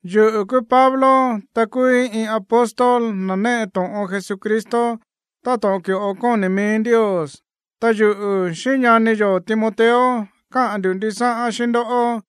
Yuꞌu̱ kúú Pablo, ta kúúí iin apóstol, na̱ néꞌe to̱ꞌon Jesucristo táto̱ꞌon ki̱ꞌo kóni̱ mií Ndios. Ta yuꞌu̱ xíꞌín ñani yo̱ Timoteo káꞌa̱n ndu̱ ndisáꞌán xíꞌín ndoꞌó,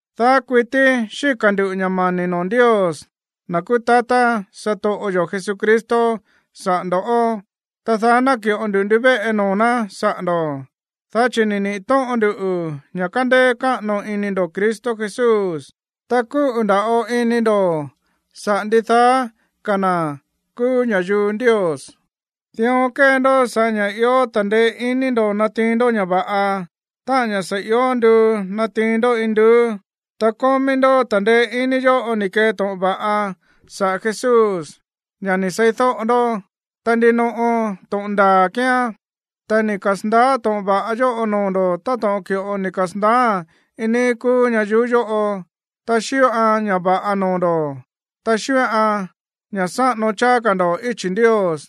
Daá kuití xíka̱ ndu̱ ña̱ mani̱ noo̱ Ndios, na̱ kúú tatá satoꞌo yo̱ Jesucristo, saꞌa̱ ndo̱ꞌó, ta daá náki̱ꞌo ndu ndivéꞌe noo̱ ná saꞌa̱ ndo̱, dá chi̱ ni̱ niꞌi̱ tóꞌon ndu ña̱ kándéé káꞌano iní ndo̱ Cristo Jesús, ta kúꞌu̱ nda̱ꞌo ini ndo̱ saꞌa̱ ndidaá ka̱ na̱ kúú ña̱yuu Ndios. Dión kée ndó sa̱ꞌá ña̱ ió ta̱ndeé iní natiin ndó ña̱ va̱ꞌa, táꞌa̱n ña̱ sa̱ ió nduu natiin ndó induú. Ta kómí ndó ta̱ndeé iní yóꞌo ni̱ kee to̱ꞌon va̱ꞌa saꞌa̱ Jesús, ña̱ ni̱ seídóꞌo ndó. Ta ndinoꞌo to̱ꞌon ndaa̱ kíán. Ta ni̱ kasa̱ndaá to̱ꞌon va̱ꞌa yóꞌo noo̱ ndo̱ꞌó táto̱ꞌon ki̱ꞌo ni̱ kasa̱ndaáa̱n iin níí kúú ñayuú yóꞌo, ta xíꞌoan ña̱ va̱ꞌa noo̱ ndo̱, ta xíꞌoan ña̱ sáꞌano cháá ka̱ ndo̱ꞌó íchi̱ Ndios.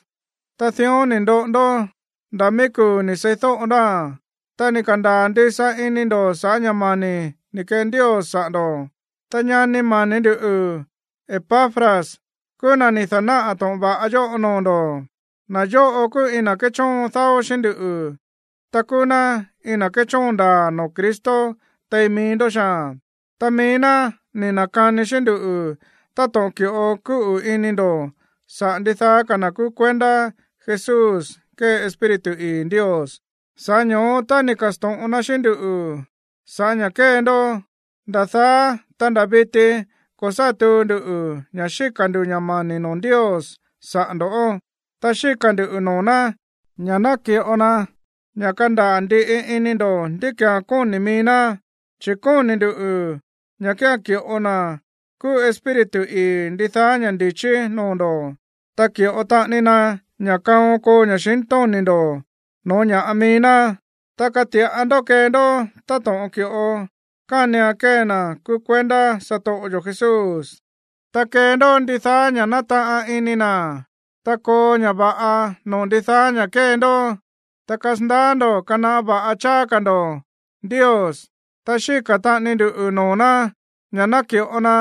Ta dión ní ndóꞌo ndó nda̱ míí kuu̱ ni̱ seídóꞌo ndóa̱n, ta ni̱ ka̱ndaa̱ ndisa ini ndo̱ sa̱ꞌá ña̱ mani̱ ni̱ kee Ndios saꞌa̱ ndo̱. Ta ñani mani̱ ndú Epafras kúú na̱ ni̱ da̱náꞌa̱ to̱ꞌon va̱ꞌa yóꞌo noo̱ ndo̱. Na̱ yóꞌo kúú iin na̱ kéchóon dáó xíꞌín ndú, ta kúú ná iin na̱ kéchóon ndaa̱ noo̱ Cristo tein mií ndó xaa̱n. Ta mií ná ni̱ na̱kani xíꞌín nduꞌu̱ táto̱ꞌon ki̱ꞌo kúꞌu̱ ini ndo̱ saꞌa̱ ndidaá ka̱ na̱ kúú kuendá Jesús kée Espíritu ii̱ Ndios. Sa̱ꞌá ño̱ó, tá ni̱ ka̱sto̱ꞌon na xíꞌín ndú sa̱ꞌá ña̱ kée ndó, nda̱ daá, ta nda̱ viti ko̱ sá tuu ndu ña̱ xíka̱ ndu̱ ña̱ mani̱ noo̱ Ndios saꞌa̱ ndo̱. Ta xíka̱ ndu̱ noo̱ ná ña̱ ná ki̱ꞌo na ña̱ kandaa̱ ndiꞌi ini ndo̱ ndí ki̱án kóni̱ mií ná, chi̱ kóni̱ ndu̱ ña̱ kía̱n ki̱ꞌo na̱ kúú Espíritu ii̱ ndidaá ña̱ ndi̱chí noo̱ ndo̱, ta ki̱ꞌo taꞌani na ña̱ kaon koo ña̱xintóni̱ ndo̱ no̱ó ña̱ꞌa mií ná, dá kati̱ꞌa ndó kee ndó táto̱ꞌon ki̱ꞌo kánian kee na̱ kúú kuendá satoꞌo yo̱ Jesús, ta kee ndó ndidaá ña̱ nátaꞌan ini na̱, ta koo ña̱ va̱ꞌa noo̱ ndidaá ña̱ kée ndó, ta kasandaá ndo̱ kanaꞌá va̱ꞌa cháá ka̱ ndo̱ Ndios. Ta xíka̱ taꞌani ndu noo̱ ná ña̱ ná ki̱ꞌo na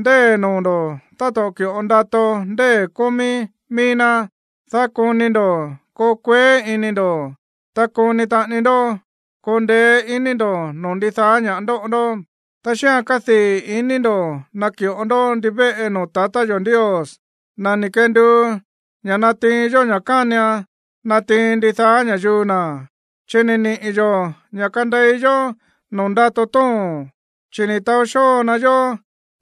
ndée̱ noo̱ ndo̱ táto̱ꞌon ki̱ꞌo ndato ndée̱ kómí mií ná, dá koni ndo̱ koo kueé iní ndo̱, ta koni taꞌani ndó koo ndeé iní ndo̱ noo̱ ndidaá ña̱ ndóꞌo ndó, ta xíꞌa̱n kadii̱ ini ndo̱ ná naki̱ꞌo ndó ndivéꞌe noo̱ tatá yo̱ Ndios, na̱ ni̱ kenduu ña̱ natiin yó ña̱ kánian natiin ndidaá ña̱yuu na̱, chi̱ ni̱ niꞌi̱ yo̱ ña̱ kandei yó noo̱ ndato tóo̱n. Chi̱ ni̱ taó xóo na yó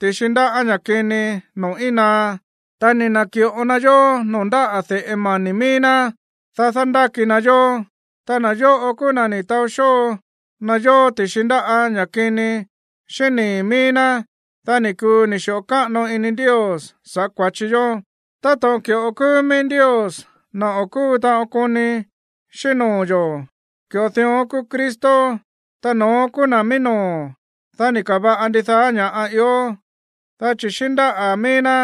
ti̱xi ndáꞌa̱ ña̱ kini noo̱ íin naá, ta ni̱ na̱ki̱ꞌo na yó noo̱ ndáꞌa̱ de̱ꞌe mani̱ mií ná, dá dándáki na yó, ta na̱ yóꞌo kúú na̱ ni̱ taó xóo na yó ti̱xi ndáꞌa̱ ña̱ kini xíꞌín nii̱ míí ná, dá ni̱ kuu ni̱ xi̱ꞌo káꞌano ini Ndios saꞌa̱ kua̱chi yó. Táto̱ꞌon ki̱ꞌo kúú míí Ndios, na̱ o̱ kúu taꞌon koni xíꞌín noo̱ yo̱, ki̱ꞌo dión kúú Cristo, ta no̱ón kúú na̱ mií noo̱, dá ni̱ ka̱va̱ꞌa ndidaá ña̱ ió. Dá chi̱ xíꞌín ndáꞌa̱ míí ná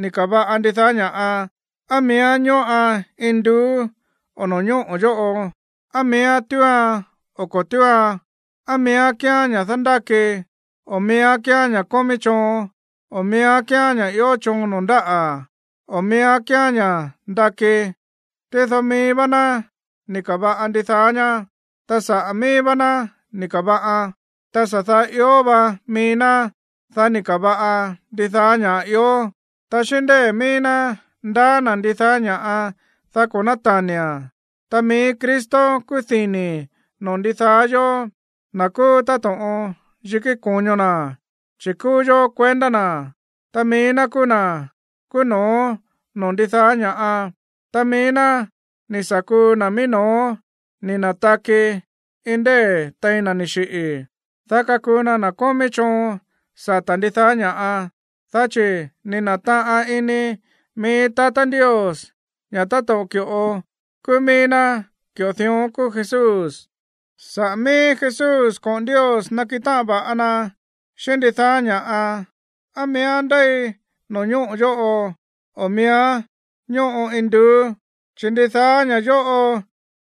ni̱ ka̱va̱ꞌa ndidaá ña̱ꞌa, á miíán ñóꞌan induú, o no̱ñóꞌo̱ yóꞌo, á miíán túuan o ko̱ túuan, á miíán kíán ña̱ dándáki, o miíán kíán ña̱ kómí choon, o miíán kíán ña̱ ió choon noo̱ ndáꞌa̱, o miíán kíán ña̱ ndakí. Tído mií vá ná ni̱ ka̱va̱ꞌa ndidaá ñá, ta saꞌa̱ mií vá ná ni̱ ka̱va̱ꞌan. Ta sa̱ daá ió va mií ná, dá ni̱ ka̱va̱ꞌa ndidaá ña̱ꞌa ió. Ta xíꞌín ndée̱ mií ná ndaá na̱ ndidaá ña̱ꞌa, dá ko̱ nátani̱a̱n. Ta mií Cristo kúú dini̱ noo̱ ndidaá yóó, na̱ kúú táto̱ꞌon yikí ko̱ño na̱, chi̱ kúú yó kuendá na̱. Ta mií ná kúú na̱ kúú no̱ó noo̱ ndidaá ña̱ꞌa. Ta mií ná ni̱ sa̱ kuu na̱ mií no̱ó ni̱ na̱taki iin ndée̱ tein na̱ ni̱ xiꞌi̱, dá kakuu na na̱ kómí choon sata̱ ndidaá ña̱ꞌa. Dá chi̱ ni̱ na̱taꞌan ini mií tatá Ndios ña̱ táto̱ꞌon ki̱ꞌo kúú míí ná, ki̱ꞌo dión kúú Jesús. Saꞌa̱ míí Jesús koꞌo̱n Ndios nakiꞌin táꞌan va̱ꞌa na xíꞌín ndidaá ña̱ꞌa, á miíán ndéi no̱ñóꞌo̱ yóꞌo o miíán ñóꞌo induú, chi̱ ndidaá ña̱ yóꞌo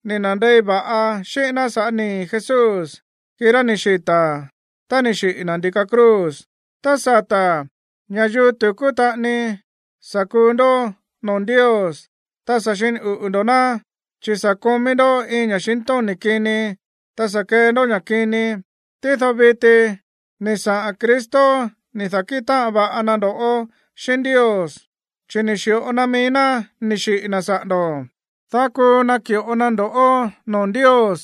ni nandei va̱ꞌa xíꞌín ná sa̱ꞌá nii̱ Jesús, kirá ni̱ xita̱ tá ni̱ xiꞌi̱ na̱ ndi̱ka cruz. Tá sata̱, ña̱yuu tu̱kú taꞌani sa̱ kuu ndó noo̱ Ndios, ta sa̱ xini uꞌu̱ ndo̱ ná, chi̱ sa̱ komí ndó iin ña̱xintóni̱ kini, ta sa̱ kee ndó ña̱ kini. Tído viti ni̱ saꞌa̱n Cristo ni̱ da̱nákiꞌin táꞌan va̱ꞌa na ndo̱ꞌó xíꞌín Ndios, chi̱ ni̱ xi̱ꞌo na mií ná ni̱ xiꞌi̱ na̱ saꞌa̱ ndo̱, dá kuu naki̱ꞌo na ndo̱ꞌó noo̱ Ndios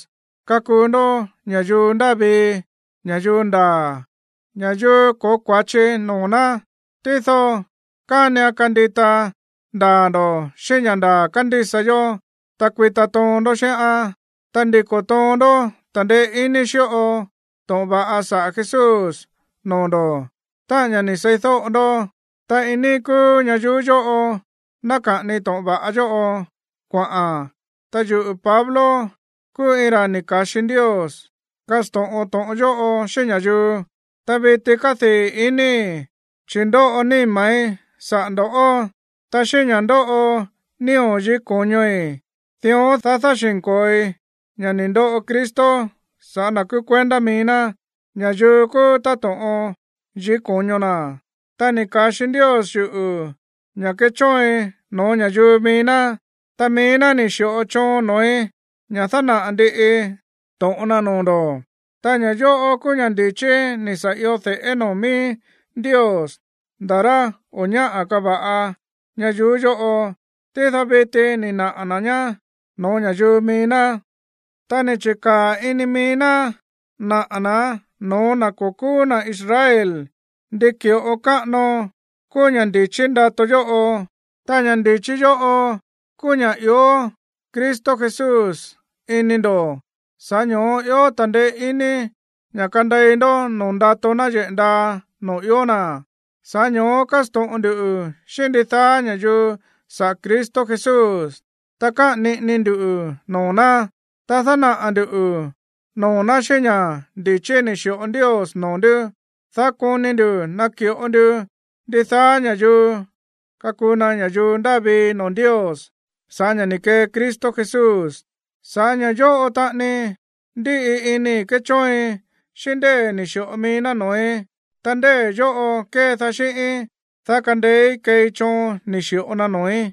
kakuu ndó ña̱yuu ndáa vii, ña̱yuu ndaa̱, ña̱yuu ko̱ó kua̱chi noo̱ ná. Tído kánian kandita ndaa̱ ndo̱ xíꞌín ña̱ ndaa̱ kándísa yó, ta kuita toon ndó xíꞌán, ta ndiko̱ toon ndó ta̱ndeé iní xíꞌo to̱ꞌon va̱ꞌa saꞌa̱ Jesús noo̱ ndo̱, táꞌa̱n ña̱ ni̱ seídóꞌo ndó. Ta iin níí kúú ñayuú yóꞌo náka̱ꞌani to̱ꞌon va̱ꞌa yóꞌo kuaꞌa̱n. Ta yuꞌu̱ Pablo kúú iin ra̱ ni̱ ka̱xi Ndios kasto̱ꞌon to̱ꞌon yóꞌo xíꞌín ña̱yuu. Ta viti kádii̱ inii̱, chi̱ ndóꞌo níma̱í saꞌa̱ ndo̱ꞌó, ta xíꞌín ña̱ ndóꞌo nío̱ yikí ko̱ñoi̱, dión, dá dáxi̱nko̱oi ña̱ ni̱ ndoꞌo Cristo sa̱ꞌá na̱ kúú kuendá mií ná, ña̱yuu kúú táto̱ꞌon yikí ko̱ño na̱. Ta ni̱ ka̱xi Ndios yuꞌu̱ ña̱ kechóoin no̱ó ña̱yuu mií ná, ta mií ná ni̱ xi̱ꞌo choon noo̱í ña̱ dánaꞌa̱ ndiꞌii to̱ꞌon na noo̱ ndo̱. Ta ña̱ yóꞌo kúú ña̱ ndi̱chí ni̱ sa̱ io de̱ꞌé noo̱ míí Ndios nda̱ rá o̱ ñáꞌa̱ kava̱ꞌa ñayuú yóꞌo. Tído viti ni̱ naꞌa̱ na̱ ñá no̱ó ña̱yuu mií ná. Ta ni̱ chi̱kaa̱ ini mií ná naꞌa̱ na̱án no̱ó na̱ ko̱ kúú na̱ Israel ndi ki̱ꞌo káꞌano kúú ña̱ ndi̱chí ndato yóꞌo. Ta ña̱ ndi̱chí yóꞌo kúú ña̱ ió Cristo Jesús ini ndo̱, sa̱ꞌá ño̱ó ió ta̱ndeé iní ña̱ kandei ndó noo̱ ndato náyeꞌe̱ ndaa noo̱ ió na̱. Sa̱ꞌá ño̱ó kásto̱ꞌon ndu xíꞌín ndidaá ña̱yuu saꞌa̱ Cristo Jesús, ta káꞌa̱n niꞌini ndu noo̱ ná, ta dánaꞌa̱ ndu̱ noo̱ ná xíꞌín ña̱ ndi̱chí ni̱ xi̱ꞌo Ndios noo̱ ndú, dá koni ndu̱ naki̱ꞌo ndu ndidaá ña̱yuu kakuu na ña̱yuu ndáa vii noo̱ Ndios sa̱ꞌá ña̱ ni̱ kee Cristo Jesús. Sa̱ꞌá ña̱ yóꞌo taꞌani ndíꞌi inii̱ kéchóoin xíꞌín ndée̱ ni̱ xi̱ꞌo mií ná noo̱í, ta ndée̱ yóꞌo kédaá xíꞌíín, dá kandeéí keei choon ni̱ xi̱ꞌo na noo̱í.